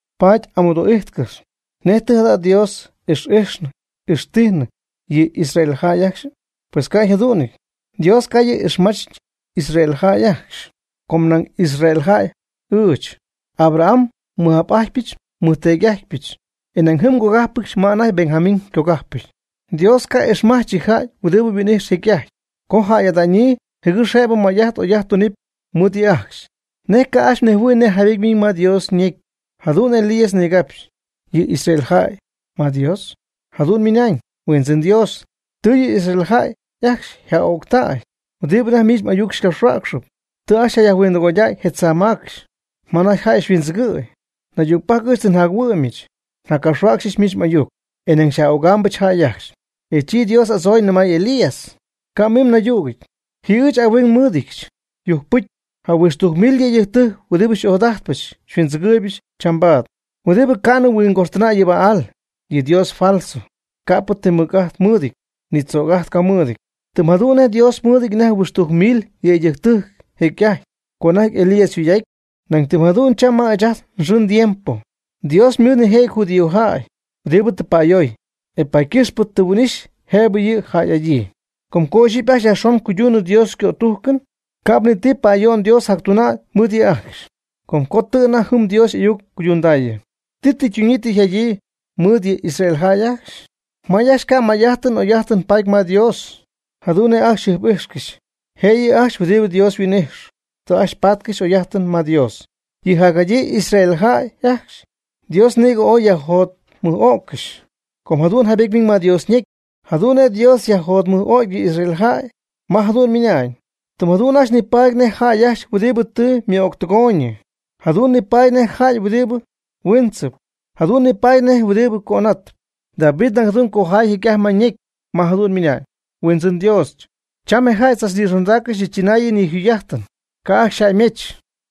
Paady n'amɨdoogɨxy: ¿Nej tɨ jada' Dios ix'ijxnɨ ixtijnɨ yɨ Israel jäy ajcxy? Pues ca' yjadu'nɨty, Dios ca' yɨ' ixmachñɨ Israel jäy ajcxy. Com nañ Israel jäy ɨɨch. Abraham nmɨj'ap'ájtɨbɨch nmɨjteedy'ájtɨbɨch e nañ jɨm ngogájpɨdyɨch ma anajty Benjamín ycogajpɨty. Dios ca' ixmach yɨ' yjäy huɨdibɨ yhuin'ijx jecy'ajty co jäy'ada'ñyii jɨgɨx jëbɨ may'ajt oy'ajt tunɨpy mɨɨd yɨ' ajcxy. ¿Nej ca' ajcxy mnejhuɨ̈y nej jaybety ymiiñ ma Dios ñecy jadu'n nej Elías nigapxy yɨ Israel jäy ma Dios? Jadu'n ymɨnañ: Huindzɨn Dios, tɨ yɨ Israel jäy ajcxy yaj'öctäy huɨdibɨ anajty miich m'ayuc xycapxhuäcxɨp. Tɨ ajcxy yajhuindɨgoydäy je tzaa macxy ma anajty jäy xyhuindzɨgɨ̈y. Naydügpajc ɨɨch tɨ njachuɨ'myɨch njaccapxhuäcxyɨch miich m'ayuc, e nañ xyaj'ögaamɨch jäy ajcxy. E chi Dios y'adzooy nɨmay Elías: Ca' mim naydügɨty, ji ɨɨch ahuing nmɨ́ɨdɨdyɨch yujcpɨcy jahuɨxtujc mil yëydɨjc huɨdi xy'ojadajtpɨch xyhuindzɨgɨɨybɨch chambaad, huɨdibɨ ca'nɨ huingoxtɨnäy yɨ Baal, yɨ dios falso, ca'pɨ ti mɨc'ajt mɨɨdɨty ni ti tzöc'ajt ca mɨɨdɨty. Tɨm jadu'n nej Dios mɨɨdɨty anajty huɨxtujc mil yëydɨjctɨjc jecy'ajty co anajty Elías yjugy'aty, nañ tɨm jadu'n cham ma ɨɨch ajt nxɨɨ ndiempo Dios ymɨɨd nijëjɨty judíojäy huɨdibɨ tɨ pa'ayoy, e paady ycɨxpɨ tɨ yhuin'ixyii jëbɨ yɨ' jäy'adyii. Com co ixyipy ajcxy yajxon cuydunɨ Dios ycötujcɨn, ca'p ni ti pa'ayo'n Dios jactunaanɨ mɨɨd yɨ' ajcxy, com co tɨ anajty jɨm Dios y'ayuc ycuydundäyii. ¿Ti tɨ ytunyii tɨ yjadyii mɨɨd yɨ Israel jäy ajcxy? May ajcxy ca' may'ajtɨn oy'ajtɨn paady ma Dios jadu'n nej ajcxy jɨjp'ijxcɨxy. Jëyɨ ajcxy huɨdi Dios huin'ijxɨ tɨ ajcxy paatcɨxy oy'ajt ma Dios. Yɨ jacjadyii Israel jäy ajcxy Dios nïg ooy yajjotmɨj'öccɨxy. Com jadu'n jaybety ymiiñ ma Dios ñecy jadu'n nej Dios yajjotmɨj'ögy yɨ Israel jäy, ma jadu'n ymɨnañ: Tɨm jadu'n ajcxy nipaady nej jäy ajcxy huɨdibɨ tɨ ymɨ'öctɨgooyñɨ, jadu'n nipaady nej jäy huɨdibɨ huiintzɨp, jadu'n nipaady nej huɨdibɨ cönatɨp. David nañ jadu'n ycojay jecy'ajty ma ñecy, ma jadu'n ymɨnañ: Huindzɨn Dios, cham je jäy tzachnixondägy yɨ tzɨnaayɨn yɨ jugy'ajtɨn, ca' ajcxy xyjäymech.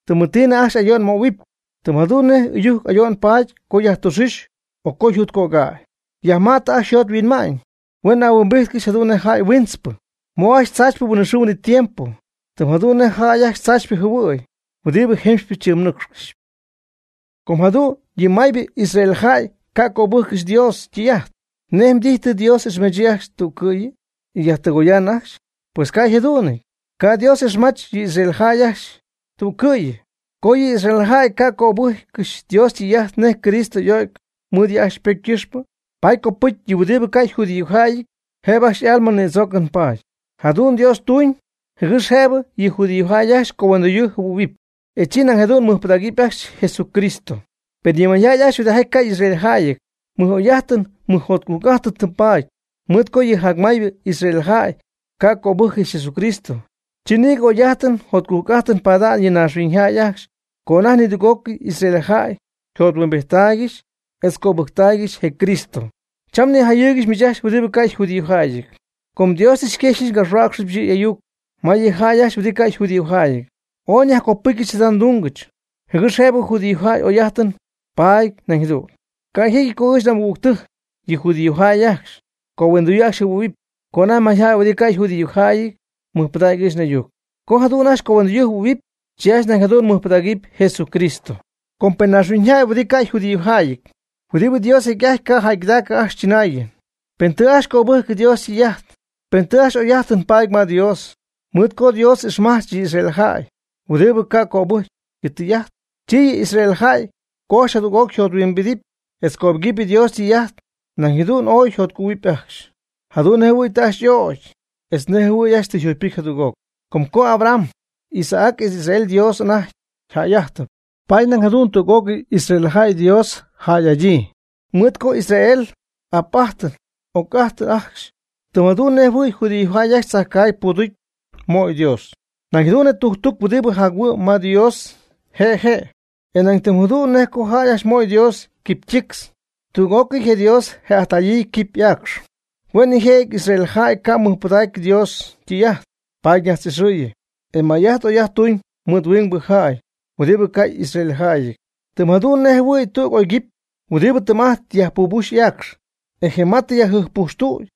Tɨmɨtiinɨ ajcxy ayo'n möhuɨpy; tɨm jadu'n nej ɨyujc ayo'n paady co yajtüxuuch o co yjut cögäy. Yajma'tɨ ajcxy yjot yhuinma'ñ, huen ahuimbijtcɨxy jadu'n nej jäy huintzpɨ. Mö ajcxy tzaachypɨ huinɨxɨɨ huinɨtiempo, tɨm jadu'n nej jäy ajcxy tzaachypɨ jɨhuɨ̈y huɨdibɨ jemxypɨ tzɨmɨ̈ccɨxp. Co jadu'n yɨ maybɨ Israel jäy ca' cöbɨjccɨxy Dios ytɨy'ajt, ¿nej mdijy, tɨ Dios y'ixmachyii ajcxy tüccɨ'yɨ, e yajtɨgoya'ñ ajcxy? Pues ca' yjadu'nɨty, ca' Dios ixmach yɨ Israel jäy ajcxy tüccɨ'yɨ. Co yɨ Israel jäy ca' cöbɨjccɨxy Dios ytɨy'ajt nej Cristo y'o'cy mɨɨd yɨ' ajcxy ypocy ycɨxpɨ, paady cöbɨcy yɨ huɨdibɨ ca' yjudíojäyɨty, jëbɨ ajcxy y'alma nïdzoocɨn paady. Jadu'n Dios ytuñ jɨgɨx jëbɨ yɨ judíojäy ajcxy cohuindoyɨɨ jɨhuɨ̈huɨpy, e chi nañ jadu'n mɨjpɨdägɨpy ajcxy Jesucristo. Pen yɨ mayjäy ajcxy huɨdijaty ca' y'israeljäyɨty mɨj'oy'ajtɨn mɨjjotcujc'ajtɨn tɨ paady, mɨɨd co yɨ jacmaybɨ Israel jäy ca' cöbɨjccɨxy Jesucristo, chi nïgɨ oy'ajtɨn jotcujc'ajtɨn pada'ñ yɨ naaxhuiñyjäy ajcxy co anajty nidüg'ócɨy Israel jäy yjothuimbijttaaygɨxy etz cöbɨjctaaygɨxy je Cristo. Cham nijayɨɨygɨxy miich ajcxy huɨdi ca' yjudíojäyɨty, com Dios tɨ xyquexyɨch ngapxhuäcxɨch yɨ' y'ayuc ma yɨ jäy ajcxy huɨdibɨ ca' yjudíojäyɨty. Ooy nyajcopɨcyɨch jada ndungɨch, jɨgɨx jëbɨ judíojäy oy'ajtɨn paady nañ jadu'n. Ca' jecyɨty co ɨɨch n'amɨgügtɨjc, yɨ judíojäy ajcxy, cohuindoyɨɨ ajcxy jɨhuɨ̈huɨpy, co anajty mayjäy huɨdi ca' yjudíojäyɨty mɨjpɨdägy ɨɨch n'ayuc. Co jadu'n ajcxy cohuindoyɨɨ jɨhuɨ̈huɨpy, chi ajcxy nañ jadu'ñ mɨjpɨdägɨpy Jesucristo. Com pen je naaxhuiñyjäy huɨdibɨ ca' yjudíojäyɨty, huɨdibɨ Dios jecy'ajty ca' jäygɨdacɨ ajcxy chɨnaayɨn, pen tɨ ajcxy cöbɨjcɨ Dios ytɨy'ajt, pen tɨ ajcxy oy'ajtɨn paady ma Dios, mɨɨd co Dios tɨ ixmach yɨ Israel jäy huɨdibɨ ca' cöbɨcy yɨ' ytɨy'ajt, chi yɨ Israel jäy co ajcxy jadüg'oc yjothuimbidɨpy etz cöbɨgɨpy Dios ytɨy'ajt, nañ jadu'n ooy yjotcugɨ̈huɨpy ajcxy, jadu'n nejjɨhuɨ̈y tɨ ajcxy y'ögy etz nej jɨhuɨ̈y ajcxy tɨ yjugypɨcy jadüg'oc. Com co Abraham, Isaac etz Israel Dios anajty jäy'ajtɨp, paady nañ jadu'n tüg'ócɨy Israel jäy Dios jäy'adyii, mɨɨd co Israel y'ap'ajtɨp y'oc'ajtɨp ajcxy. Tɨm jadu'n nejjɨhuɨ̈y judíojäy ajcxy tzajcaagy puuducy möy Dios, nañ jadu'n je ytujctuc huɨdibɨ jac-huɨ'm nañ Dios je' yje', e nañ tɨm jadu'n nej co jäy ajcxy möy Dios quipy ytictz, tüg'ócɨyɨ je' Dios je'ajtäyii quipy y'aacxy. Hue' je' nijëjɨty Israel jäy ca' mɨjpɨdägy Dios ytɨy'ajt, paady ñajtz'ixɨɨyɨ, e may'ajt oy'ajt tuñ mɨɨd huingbɨ jäy huɨdi ca' israeljäyɨty. Tɨm jadu'n nej jɨhuɨ̈y tüg oyguipy huɨdi tɨɨm'ajtp yajpubuxy y'aacx, e je ma tɨ yajjɨjppujxtüty,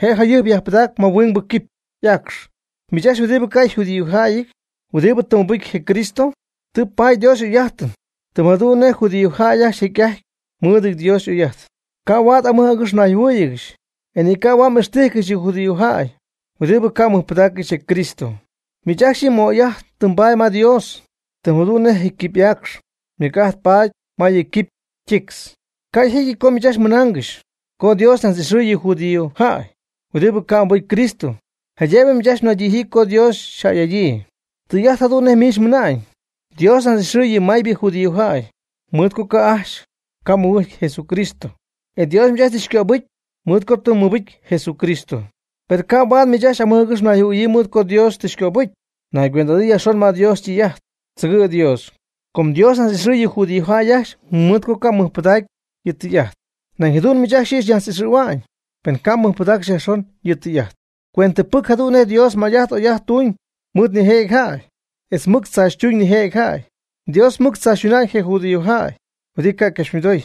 je' yjɨjp yajpɨdägy ma huingbɨ quipy y'aacx. Miich ajcxy huɨdi ca' yjudíojäyɨty huɨdibɨ tɨ mɨbɨcy je Cristo, tɨ mbaady Dios y'oy'ajt tɨm jadu'n nej judíojäy ajcxy jecy'ajty mɨɨdɨty Dios y'oy'ajt. Ca' huaad amɨj agɨx mnayjɨhuɨɨygɨxy, e ni ca' huaad m'ixtijcɨxy yɨ judíojäy huɨdibɨ ca' mɨjpɨdaaccɨxy je Cristo. Miich ajcxy yɨ m'oy'ajt tɨ mbaady ma Dios, tɨm jadu'n nej je quipy y'aacx mɨc'ajt paady ma yɨ quipy ytictz. Ca' yjecyɨty co miich ajcxy mɨna'naangɨxy co Dios najtz'ixɨɨy yɨ judíojäy huɨdibɨ ca' mɨbɨcy Cristo, jaydëbɨ miich ajcxy mnaydijyii co Dios xyjäy'adyii. Tɨy'ajt jadu'n nej miich mɨna'ñ. Dios ñajtz'ixɨɨy yɨ maybɨ judíojäy mɨɨd co ajcxy ca' mɨbɨcy Jesucristo. E Dios miich tɨ xycöbɨcy mɨɨd co tɨ mmɨbɨcy Jesucristo. Per ca' huaad miich amɨj agɨx mnayjɨhuɨ̈yii mɨɨd co Dios tɨ xycöbɨcy. Naygüend'adɨɨ yajxon ma Dios ytɨy'ajt, tzɨgɨ' Dios. Com Dios ñajtz'ixɨy yɨ judíojäy ajcxy mɨɨd co ca' ymɨjpɨdägyii yɨ' ytɨy'ajt. Nañ jadu'n miich ajcxy yɨ' xyñajtz'ixɨ̈hua'ñ, pen ca' mmɨjpɨdaaccɨxy yajxon yɨ' ytɨy'ajt. Cuentɨpɨc jadu'n nej Dios may'ajt oy'ajt tuñ mɨɨd nijëjɨty jäy, etz mɨc tzaachytuñ nijëjɨty jäy. Dios mɨc tzaachytuñ je judíojäy huɨdibɨ ca' ycapxymɨdoy,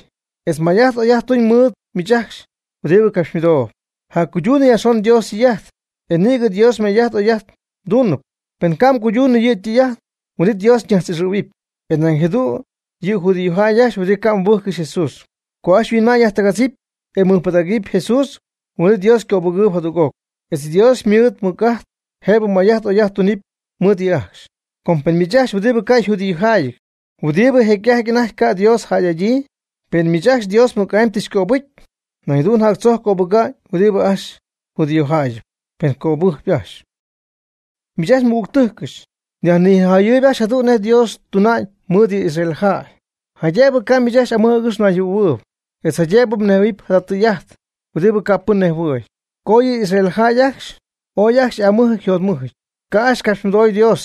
etz may'ajt oy'ajt tuñ mɨɨd miich ajcxy huɨdi capxymɨdoob. Jaccuydun yajxon Dios ytɨy'ajt, e nïgɨ Dios may'ajt oy'ajt xytuunɨpy, pen ca' mguydunɨ yɨ' ytɨy'ajt, huin'it Dios xyñajtz'ixɨ̈huɨpy. E nañ jadu'n yɨ judíojäy ajcxy huɨdi ca' mɨbɨjccɨxy Jesús, co ajcxy yhuinma'ñ yajtɨgadzɨpy, e mɨjpɨdägɨpy Jesús, huin'it Dios ycöbɨgɨɨyb jadüg'oc, etz Dios mɨɨd ymɨc'ajt jëbɨ may'ajt oy'ajt tunɨpy mɨɨd yɨ' ajcxy. Com pen miich ajcxy huɨdi ca' yjudíojäyɨty huɨdibɨ jecy'ajty anajty ca' Dios jäy'adyii, pen miich ajcxy Dios mɨc'amy tɨ xycöbɨcy, nañ jadu'n jactzojc cöbɨga'ñ huɨdibɨ ajcxy judíojäyɨp, pen ycöbɨjcy ajcxy. Miich ajcxy nmɨgügtɨjcɨch, nyajnijayɨɨyb ajcxy jadu'n nej Dios tuna'ñ mɨɨd yɨ Israel jäy, jaydëbɨ ca' miich ajcxy amɨj agɨx mnayjɨhuɨ̈huɨɨyb, etz jaydëbɨ mnejhuɨ̈huɨpy jada tɨy'ajt huɨdibɨ ca' pɨn nejhuɨ̈y, co yɨ Israel jäy ajcxy ooy ajcxy y'aamɨjɨty yjotmɨjɨty, ca' ajcxy capxymɨdoy Dios.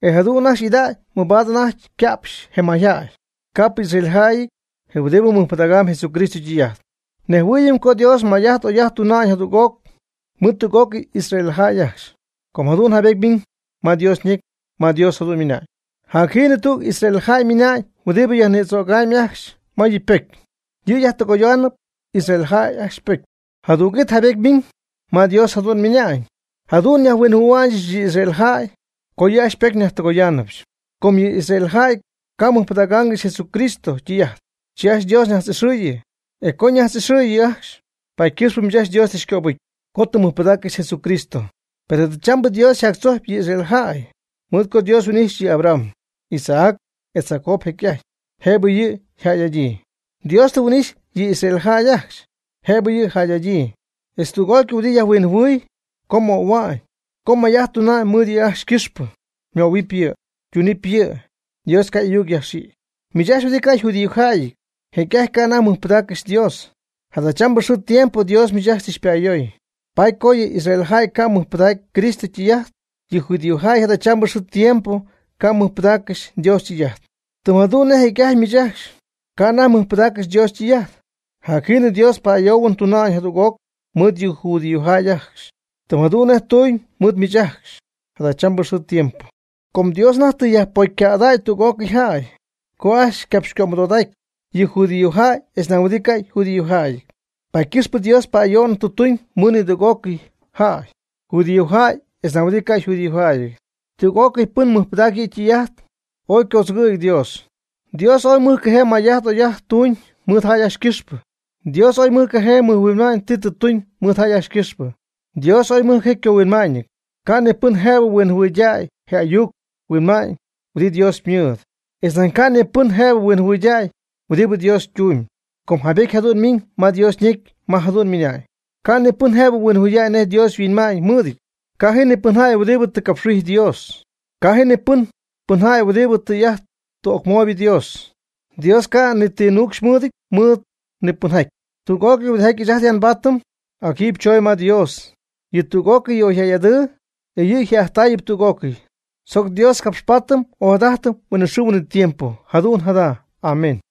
E jadu'n ajcxy y'ida'ñ mabaad anajty yca'pxy je mayjäy, ca'pɨ y'israeljäyɨty je huɨdibɨ mɨjpɨdägam Jesucristo ytɨy'ajt. Nejhuɨɨyɨm co Dios may'ajt oy'ajt tunamb jadüg'oc mɨɨd tüg'ócɨy Israel jäy ajcxy, com jadu'n jaybety ymiñ ma Dios ñecy ma Dios jadu'n ymɨna'ñ: Jacjiinɨ tüg Israel jäy ymina'ñ huɨdibɨ yajnïdzögamb ajcxy ma yɨ' ypocy. Yɨ' yajtɨgoyaanɨp Israel jäy ypocy. Jadüg'it jaybety ymiñ ma Dios jadu'n ymɨna'ñ: Jadu'n nyajhuinhuanɨɨyɨch yɨ Israel jäy co yɨ' ajcxy ypocy nyajtɨgooybɨch. Co yɨ Israel jäy ca' mɨjpɨdaaccɨxy Jesucristo ytɨy'ajt, chi Dios ajcxy ñajtz'ixɨɨyɨ. E co ñajtz'ixɨɨyɨ ajcxy, paady ycɨxpɨ miich ajcxy Dios tɨ yxcöbɨcy, co tɨ mmɨjpɨdaaccɨxy Jesucristo. Per chambaad Dios jactzojctay yɨ Israel jäy mɨɨd co Dios huin'ijxy yɨ Abraham, Isaac etz Jacob jecy'ajty jëbɨ yɨ' yjäy'adyii. Dios tɨ huin'ixy yɨ Israel jäy ajcxy jëbɨ yɨ' yjäy'adyii, etz tüg'ócɨy huɨdi yajhuinhuanɨɨy co möhua'ñ, co may'ajt tuna'ñ mɨɨd yɨ' ajcxy ycɨxpɨ. Ymöhuɨpy yɨ', ytunɨpy yɨ'. Dios ca' y'ayuc yajxïgy. Miich ajcxy huɨdi ca' yjudíojäyɨty jecy'ajty ca' anajty mmɨjpɨdaaccɨxy Dios. Jadachambɨ xɨɨ tiempo Dios miich ajcxy tɨ xypa'ayoy, mɨɨd co yɨ Israel jäy ca' mɨjpɨdägy Cristo ytɨy'ajt. Yɨ judíojäy jadachambɨ xɨɨ tiempo ca' mɨjpɨdaaccɨxy Dios ytɨy'ajt, tɨm jadu'n nej jecy'ajty miich ajcxy ca' anajty mmɨjpɨdaaccɨxy Dios ytɨy'ajt. Jacjiinɨ Dios pa'ayoohuɨn tuna'ñ jadüg'oc mɨɨd yɨ judíojäy ajcxy tɨm jadu'n nej ytuñ mɨɨd miich ajcxy jadachambɨ xɨɨ tiempo. Com Dios anajty tɨ yajpocycädäy tüg'ócɨy jäy co ajcxy ycapxycömɨdodacy, yɨ judíojäy etz nañ huɨdi ca' yjudíojäyɨty, paady ycɨxpɨ Dios pa'ayo'n tuñ mɨɨd nidüg'ócɨy jäy, judíojäy etz nañ huɨdi ca' yjudíojäyɨty, tüg'ócɨy pɨn mɨjpɨdacp yɨ' ytɨy'ajt. ¡Ooy ycodzɨgɨ̈jɨty Dios! Dios ooy mɨjcajee may'ajt oy'ajt tuñ mɨɨd jäy ajcxy ycɨxpɨ. Dios ooy mɨjcajee mɨjhuinma'ñ tɨ tuñ mɨɨd jäy ajcxy ycɨxpɨ. Dios ooy mɨjcajee ycohuinma'ñɨty. Ca' ni pɨn jëbɨ huinjɨhuɨydäy je ayuc huinma'ñ huɨdi Dios ymɨɨd. Etz nañ ca' ni pɨn jëbɨ huinjɨhuɨydäy huɨdibɨ Dios ytumyb. Com jaybety jadu'n miiñ ma Dios ñecy ma jadu'n ymɨna'ñ: Ca' ni pɨn jëbɨ huinjɨhuɨydäy nej Dios yhuinma'ñ mɨɨdɨty. Ca' ji ni pɨnjäy huɨdi tɨ capxhuijy Dios. Ca' ji ni pɨnjäy huɨdi tijaty tɨ ocmooybɨ Dios. Dios ca' ni ti nuucxy mɨɨdɨty mɨɨd ni pɨnjäy. Tüg'ócɨy huɨdijaty ɨɨch ajt ya nbaatɨm, ac jiiby choondäy ma Dios. Yɨ' tüg'ócɨy tɨ yaj'oyɨydäy, e yɨ' je'ajttaayɨp tüg'ócɨy. ¡Tzoc Dios capxpaatɨm ojadajtɨm huinɨxɨɨ huinɨtiempo! Jadu'n jadu'n. Amén.